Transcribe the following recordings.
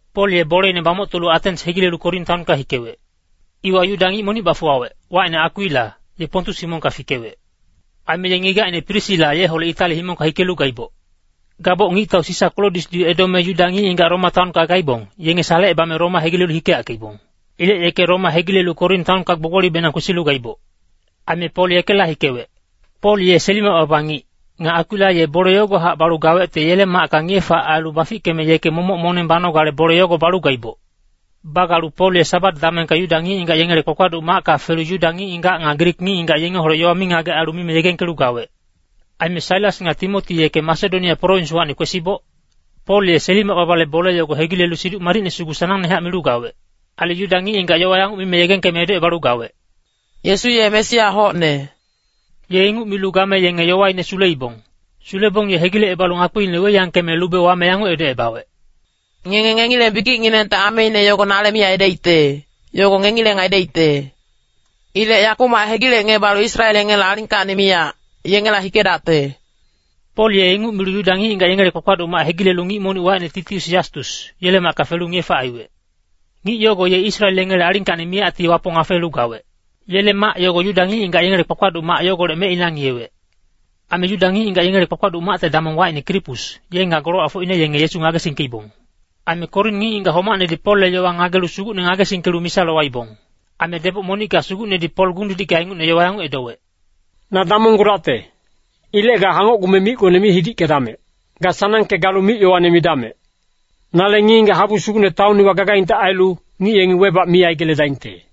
Pol ye boleine bamoctolu Atens hegilelu Korin taonka hikewec. Iwa Yuda ngic monic bafuwawec, wacine Akwila, ye Pontus himongka fikewec. Aime ye ngigacine Prisila yeholec Itali himongka hikelu gaiboc. Gaboc ngictau Sisa Klodiusdi edome Yuda ngic-ngigac Roma taonka gaibong, yenge salecebame Roma hegilelu hikeyackeibong. Ilec yeke Roma hegilelu Korin taonka gbogbolibenang kwesilu gaiboc. Aime Pol yekela hikewec. Pol ye seli-mac baba ngic, nga Akwila ye bole yogohac balu gawecte yele macka ngiye-fac ailu bafickeme yeke momoc moneng banogale bole yogo balu gaiboc. Bagalu Pol ye Sabat damengka Yuda ngic-ngigac yengele kpakpaduc macka felu Yuda ngic-ngigac nga Grik ngic-ngigac yengeholec yowa mingagec ailu mime yegengkelu gawec. Aime Sailas nga Timoti yeke Masedonia prowinswacni kwesiboc, Pol ye seli-mac babale bole yogo hegilelu Siduc Madicne sugu sanangnehac milu gawec. Ailu Yuda ngic-ngigac yowa yanguc mime yegengkeme edocebalu gawec, “Yesu ye Mesia hocne.” Ye inguc milu game yenge yowaine suleibong. Sulebong ye hegilecebalu ngakpiine weiyangkeme lube wame yanguc edocebawec, “Ngenge ngengileng bikicnginengte ameine yogo nale mi aidaicte, yogo ngengileng aidaicte. Ilec yakumac hegilecngebalu Israel yengele alingkacni miyac, yengela hikedacte.” Pol ye inguc milu Yuda ngic-ngigac yengele kpakpaduc mac hegilelu ngic monic wacine Titius Yastus, yele macka felu ngiye-fac aiwec. Ngic yogo ye Israel yengele alingkacni miyacti Wapong afeelu gawec. Yele mac yogo Yuda ngic-ngigac yengele kpakpaduc mac yogolec mecina ngiyewec. Aime Yuda ngic-ngigac yengele kpakpaduc macte damong wacine Krispus, ye nga golowacfocine yenge Yesu ngagesingkeibong. Aime Korin ngic-ngigac homacnedi Polle yowa ngagelu Sugucne ngagesingkelu misa lowaibong. Aime deboc monicka Sugucnedi Pol gung-didicka ingucne yowa yanguc edowec, “Na damonggudacte. Ilec ga hangocgume micgone mi hidickedamec. Ga sanangke galu mic-yowane midamec. Nale ngic-ngigac habu sugucne taon iwa gagaingte ailu, ngic yengi webac mi aigeledaingte.”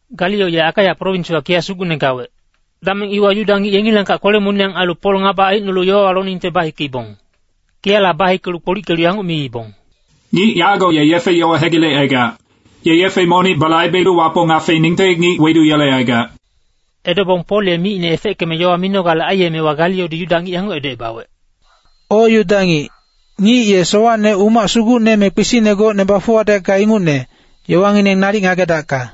Galio ye Akaia prowinswa kiya sugucne gawec. Dameng iwa Yuda ngic yengilangkac kwele-moniyang ailu Pol ngaba aicnolu yowawa loningte bahikeibong. Kiyala bahikelu kpolickelu yanguc miibong, “Ngic yago ye yefe-yowa hegilecaigac. Ye yefe monic balaibelu Wapong afeeningte ngic weduyelecaigac.” Edobong Pol ye micine efeckeme yowa minogale aiyemewa Galiodi Yuda ngic yanguc edocebawec, “O Yuda ngic, ngic ye sowacne umac sugucne me kpisicne gocne bafuwadecka ingucne, yowangineng nalic ngagedacka.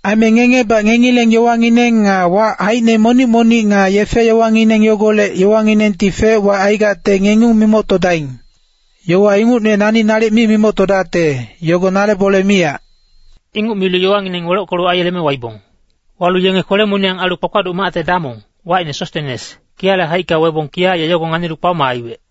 Aime ngengebac ngengileng yowangineng nga wac haicine monic-monic nga yefe-yowangineng yogolec yowanginengti fec-wac aigacte ngengung mimoctodaing. Yowa ingucne nani nalic mi mimoctodacte, yogo nale bole miyac.” Inguc milu yowangineng welockelu aiyeleme waibong. Walu yenge kwele-moniyang ailu kpakpaduc macte damong, wacine Sostenes, kiyale haicka webong kiya ye yogo nganilu kpaoma aiwec.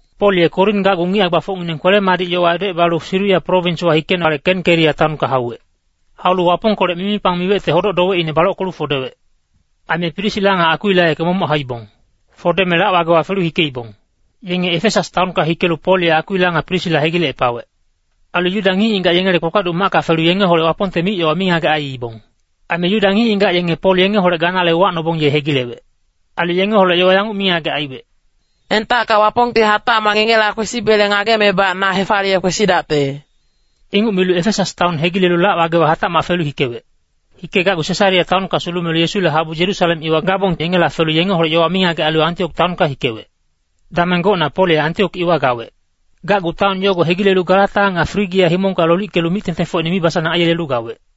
Pol ye Korin gacgu ngic hae-gbafocngineng kwele-madic yowa edocebalu Siria prowinswa hikenale Kenkeria taonka hauwec. Haulu Wapongkolec mimipang miwecte hodoc-dowecine balockelu fodewec. Aime Prisila nga Akwila yeke momoc hauibong. Fodeme lac-wagewa felu hikeibong. Yenge Efesas taonka hikelu Pol ye Akwila nga Prisila hegilecepawec. Ailu Yuda ngic-ngigac yengele kpakpaduc macka felu yengeholec Wapongte mic-yowa mingagec aiibong. Aime Yuda ngic-ngigac yenge Pol yengeholec ganale uwacnobong ye hegilewec. Ailu yengeholec yowa yanguc mingagec aiwec. “Entacka Wapongti hatacmac ngengela kwesibele ngagemebac na hefaliye kwesidacte.” Inguc milu Efesas taon hegilelu lac-wagewa hatacmac felu hikewec. Hikegacgu Sesarea taonka sulumelu Yesule habu Yerusalem iwa gabong yengela felu yengeholec yowa mingagec ailu Antiok taonka hikewec. Dameng gocna Pol ye Antiok iwa gawec. Gacgu taon yogo hegilelu Galata nga Frigia himongka lolickelu mic-tengtengfocine mibasanang aiyelelu gawec.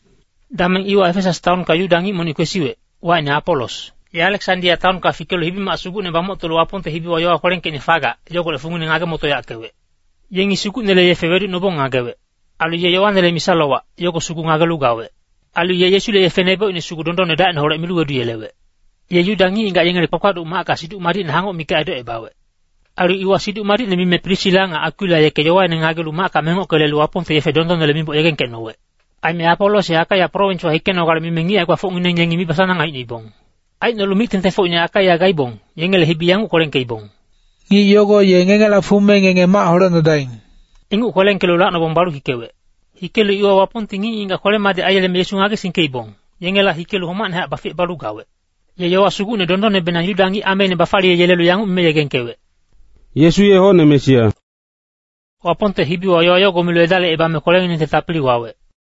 Dameng iwa Efesas taonka Yuda ngic monic kwesiwec, wacine Apolos. Ye Aleksandia taonka fikelu hibi-mac sugucne bamoctolu Wapongte hibiwa yowa kwelengkeicne fagac, yogolec fungine ngage-motoyackewec. Yengi Sugucnele yefe weducnobong ngagewec. Ailu ye Yoanele misa-lowac, yogo sugu ngagelu gawec. Ailu ye Yesule yefe nebocine sugu dondonne dacineholec milu weduyelewec. Ye Yuda ngic-ngigac yengele kpakpaduc macka Siduc Madicne hangoc mikac edocebawec. Ailu iwa Siduc Madicne mime Prisila nga Akwila yeke yowaine ngagelu macka mengocke lelu Wapongte yefe dondonnele miboc yegengkecnowec. Aime Apolos ye Akaia prowinswa hikenogale mime ngic hae-gbafocngineng yengi mibasanang aicnoibong. Aicnolu mic-tengtengfocine Akaia gaibong, yengele hibi yanguc kwelengkeibong, “Ngic yogo ye ngengela fume ngenge mac holecnodaing.” Inguc kwelengkelu lacnobong balu hikewec. Hikelu iwa Wapongti ngic-ngigac kwele-madic aiyeleme Yesu ngagesingkeibong, yengela hikelu homacnehac baficebalu gawec. Ye yowa sugucne dondonnebenang Yuda ngic ameine bafaliyeyelelu yanguc mime yegengkewec, “Yesu ye hocne Mesia.” Wapongte hibiwa yowa yogo milu edalicebame kwelenginengte tapili wawec.